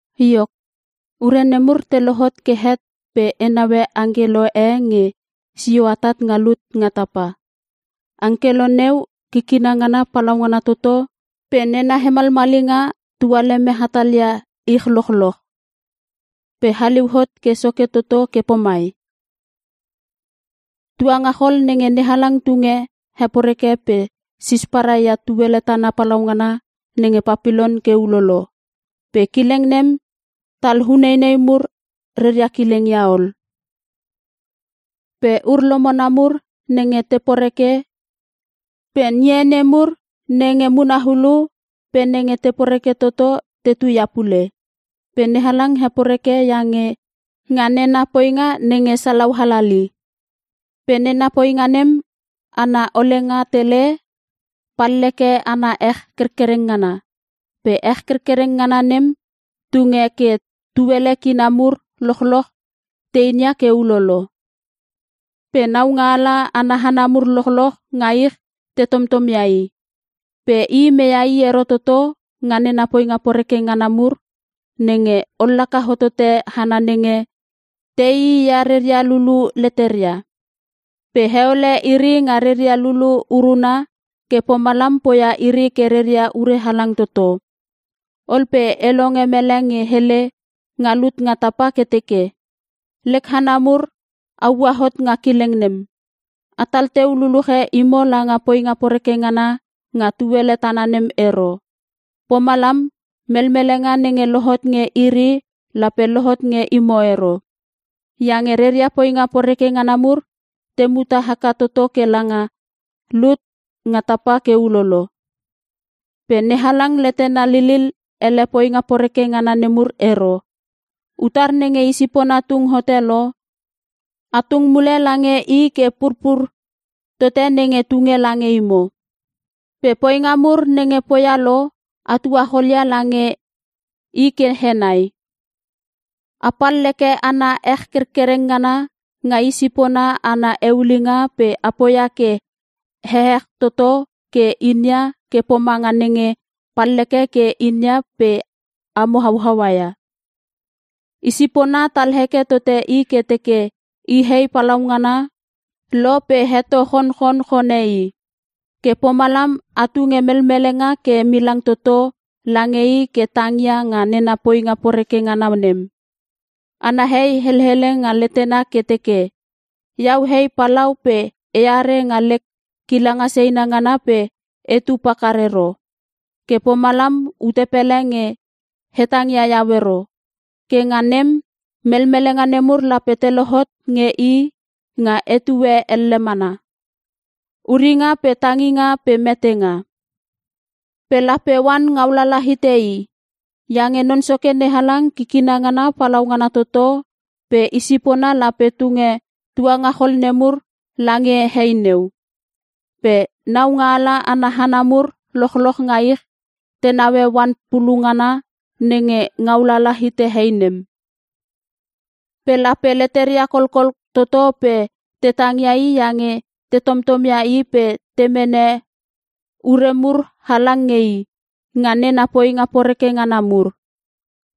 Iok, ure nemur te lohot ke het pe e naue angkelo e nge sio atat nga lut nga tapa. Angkelo neu kikina ngana palaungana toto pe nena hemalmalinga tualeme hatalia ich lochloch. Pe haliu hot ke soke toto ke pomai, “Tuangachol nenge NeHalang tunge heporeke pe sisparai ia tuele tana palaungana nenge Papilon ke ulolo! Pe kileng nem tal uneinei mur reria kileng ia ol. Pe ur-lomona mur nenge te poreke pe ngie nemur nenge muna ulu pe nenge te poreke toto tetu ia pule. Pe NeHalang heporeke iange nga nena poinga nenge salau halali. Pe nena poinga nem ana olenga tele, palleke ana ech kerkereng ngana. Pe ech kerkereng ngana nem tunge ke tuele kina mur lochloch te inia ke ulolo. Pe naungaala ana hana mur lochloch nga ich te tomtom ia i. Pe i meia i ero toto nga nena poinga poreke ngana mur, nenge ollaka hotote hana nenge teii ia reria lulu leteria. Pe heole iri nga reria lulu uruna ke pomalam poia iri ke reria ure halang toto.” Ol pe e longe mele nge hele nga lut nga tapa ke teke, “Lek hana mur a ua hot nga kileng nem! Atal teu luluche imo langa poinga poreke ngana nga tuele tana nem ero. Pomalam, melmelenga nenge lohot nge iri lape lohot nge imo ero. Iange reria poinga poreke ngana mur te muta haka toto kela nga lut nga tapa ke ulolo. Pe NeHalang letena lilil ele poinga poreke ngana nemur ero. Utar nenge i sipona tung hote lo, a tung mule lange i ke purpur tote nenge tunge lange imo. Pe poinga mur nenge poia lo, a tuachol ia lange i ke henai. A palleke ana ech kerkereng ngana nga i sipona ana eulinga pe a poia ke ehech toto ke inia ke pomanga nenge palleke ke a inia pe amo hauaua ia. Isipona tal heke tote i ke teke i hei palaungana lo pe heto chonchonchone i. Ke pomalam a tunge melmelenga ke milang toto lange i ke tangia nga nena poinga poreke ngana nem. Ana hei helele nga letena ke teke, ‘Iau hei palau pe eare nga lek kilanga seina ngana pe etu pakar ero. Ke pomalam ute pele nge hetang ia iau ero!’ Ke nga nem, melmelenga nemur lape te lohot nge i nga etue elle mana: uringa pe tanginga pe metenga. Pe lape oan ngaulala hite i. Iange Non Soke NeHalang kikina ngana palaungana toto pe Isipona lape tunge tuangachol nemur lange hei neu. “Pe naungaala ana hana mur lochloch nga ich te naue oan pulu ngana nenge ngaulala hite hei nem. Pe lape leteria kolkol toto pe te tangia i iange te tomtomia i pe te mene ure mur halang nge i, nga nena poinga poreke ngana mur.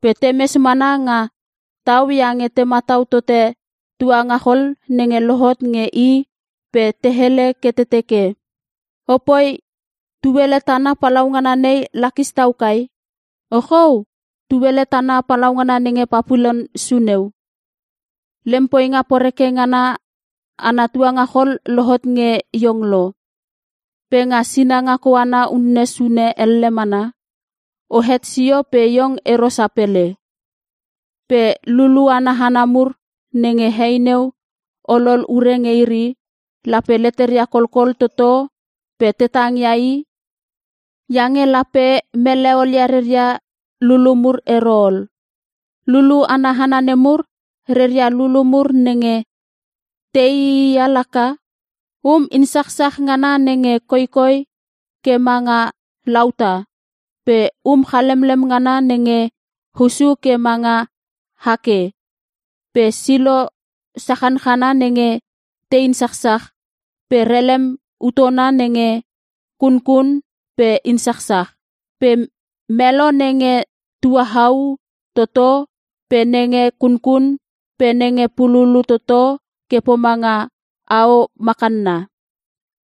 Pe temes mana nga tau iange te matau tote tuangachol nenge lohot nge i pe te hele ke te teke, “‘Opoi! Tuele tana palaungana nei lakis tau kai! Ochou! Tuele tana palaungana nenge Papilon suneu! Lem poinga poreke ngana ana tuangachol lohot nge iong lo. Pe nga sinanga koana unne sune elle mana, ohet sio pe iong ero sapele!’” “Pe lulu ana hana mur nenge hei neu olol ure nge iri, lape leteria kolkol toto pe te tangia i, iange lape mele olia reria lulu mur ero ol. Lulu ana hana nemur, reria lulu mur nenge te iiia laka: Um insachsach ngana nenge koikoi ke manga lauta, pe um chalemlem ngana nenge hussu ke manga hake, pe silo sachanchana nenge te insachsach, pe relem utona nenge kunkun pe insachsach. Pe melo nenge tuahau toto, pe nenge kunkun, pe nenge pululu toto ke pomanga ao makanna,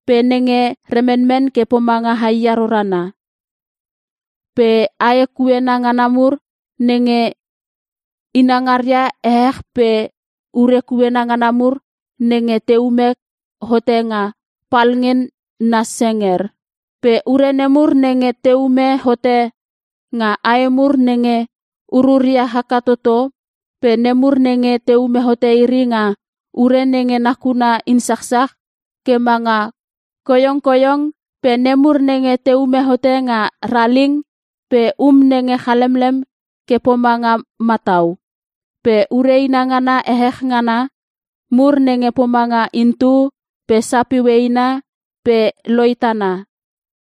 pe nenge remenmen ke pomanga haia rorana. Pe ae kuena ngana mur nenge inangaria ehech pe ure kuena ngana mur nenge teume hote nga palngen na senger. Pe ure nemur nenge teume hote nga ae mur nenge ururia haka toto, pe nemur nenge teume hote iri nga ure nenge nakuna insachsach ke manga koiongkoiong, pe nemur nenge teume hote nga raling, pe um nenge chalemlem ke pomanga matau. Pe ure inangana ehech ngana mur nenge pomanga intu, pe sapiu eina, pe loitana.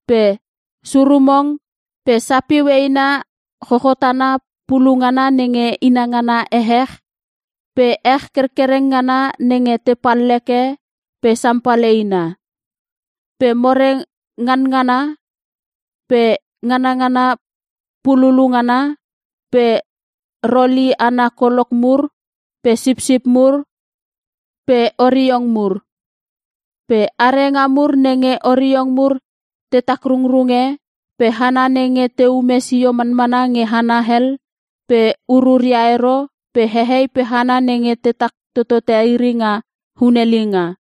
Pe surumong, pe sapiu eina chochotana pulu ngana nenge inangana ehech, pe ech kerkereng ngana nenge te palleke, pe sampal eina. Pe more nganangana, pe nganangana pululu ngana, pe roli ana kolok mur, pe sipsip mur, pe oriong mur. Pe arenga mur nenge oriong mur te takrungrunge, pe hana nenge teume sio manmana nge hana hel pe ururia ero, pe hehei pe hana nenge tetak totote iri nga hunelinga.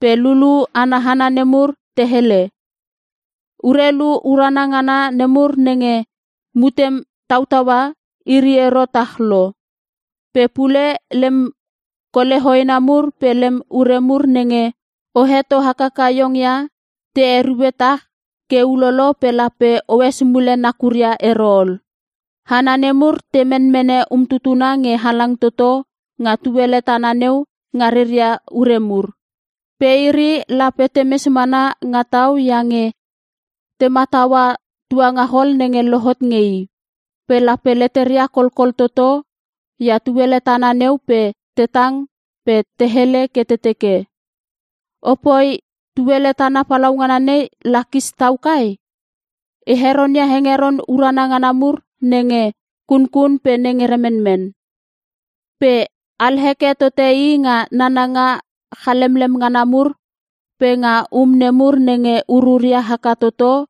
“Pe lulu ana hana nemur te hele, ‘Urelu urana ngana nemur nenge mutem tautaua, iri ero tah lo. Pe pule lem kole hoena mur pe lem ure mur nenge o heto hakaka iong ia, te erue tah ke ulolo pe lape oes mule nakuria ero ol.’ Hana nemur te menmene umtutuna nge halang toto nga tuele tana neu nga reria ure mur. Pe iri lape temes mana nga tau iange te mataua tuangachol nenge lohot nge i. Pe lape leteria kolkol toto ia tuele tana neu pe te tang pe te hele ke te teke, “‘Opoi! Tuele tana palaungana nei lakis tau kai! I heronia hengeron urana ngana mur nenge kunkun pe nenge remenmen. Pe alheke tote i nga nananga chalemlem ngana mur pe nga um nemur nenge ururia haka toto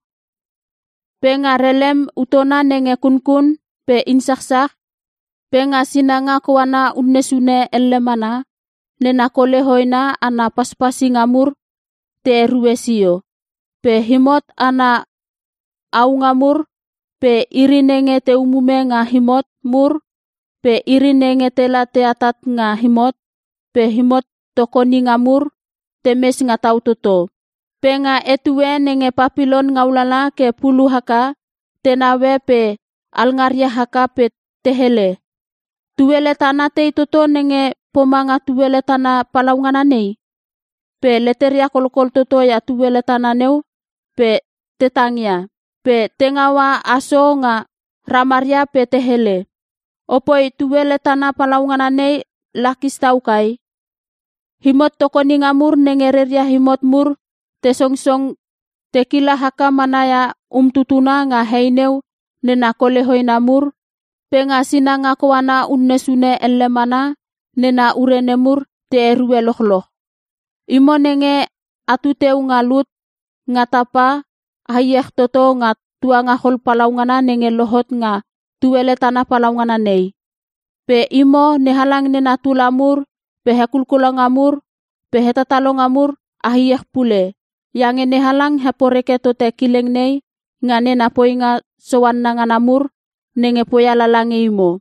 pe nga relem utona nenge kunkun pe insachsach! Pe nga sinanga koana unne sune elle mana nena kole hoena ana paspasinga mur te erue sio!’ “Pe imot ana aunga mur, pe iri nenge te umume nga imot mur, pe iri nenge tela teatat nga imot, pe imot tokoninga mur, temes nga tau toto. Pe nga etue nenge Papilon ngaulala ke pulu haka, te naue pe alngaria haka pe te hele, ‘Tuele tana tei toto nge pomanga tuele tana palaungana nei!?’ Pe leteria kolkol toto ia tuele tana neu pe te tang ia. Pe te ngaua aso nga ramaria pe te hele, “‘Opoi! Tuele tana palaungana nei lakis tau kai! Imot tokoninga mur nenge reria imot mur te songong tekila haka mana ia umtutuna nga hei neu nena kole hoena mur! Pe nga sinanga koana unne sune elle mana nena ure nemur te erue lochloch! Imo nenge a tuteu nga lut nga tapa a iech toto nga tuangachol palaungana nenge lohot nga tuele tana palaungana nei! Pe imo NeHalang nena tula mur pe hekulkulonga mur pe hetatalonga mur a iech pule! Iange NeHalang heporeke tote kileng nei nga nena poinga soanna ngana mur nenge poia lala nge imo!’”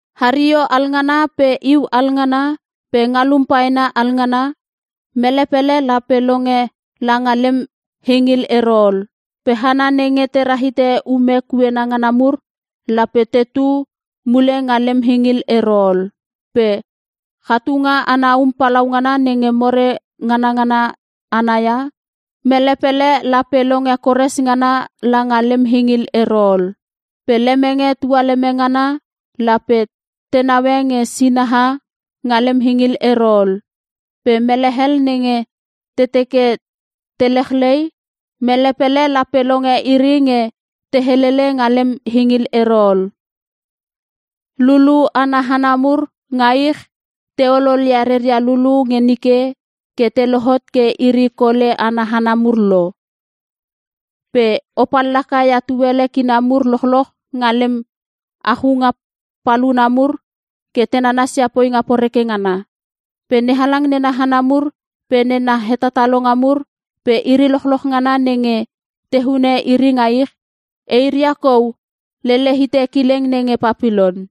Hario alngana pe iu alngana pe ngalum paena alngana, mele pele lape longe langa lem hingil ero ol. Pe hana nenge te rahite ume kuena ngana mur lape tetu mule nga lem hingil ero ol. Pe chatunga ana um palaungana nenge more nganangana ana ia, mele pele lape longe kores ngana langa lem hingil ero ol. Pe lemenge tualeme ngana, lape te naue nge sinaha nga lem hingil ero ol. Pe mele hel nenge te teke te lechlei, mele pele lape longe iri nge te helele nga lem hingil ero ol. Lulu ana hana mur nga ich, o ololia reria lulu nge nike ke te lohot ke iri kole ana hana mur lo. Pe o pallaka ia tuele kina mur lochloch nga lem achunga paluna mur ke te nanasia poinga poreke ngana. Pe NeHalang nena hana mur pe nena hetatalonga mur pe iri lochloch ngana nenge te hune iri nga ich, eiria kou lele hite kileng nenge Papilon.”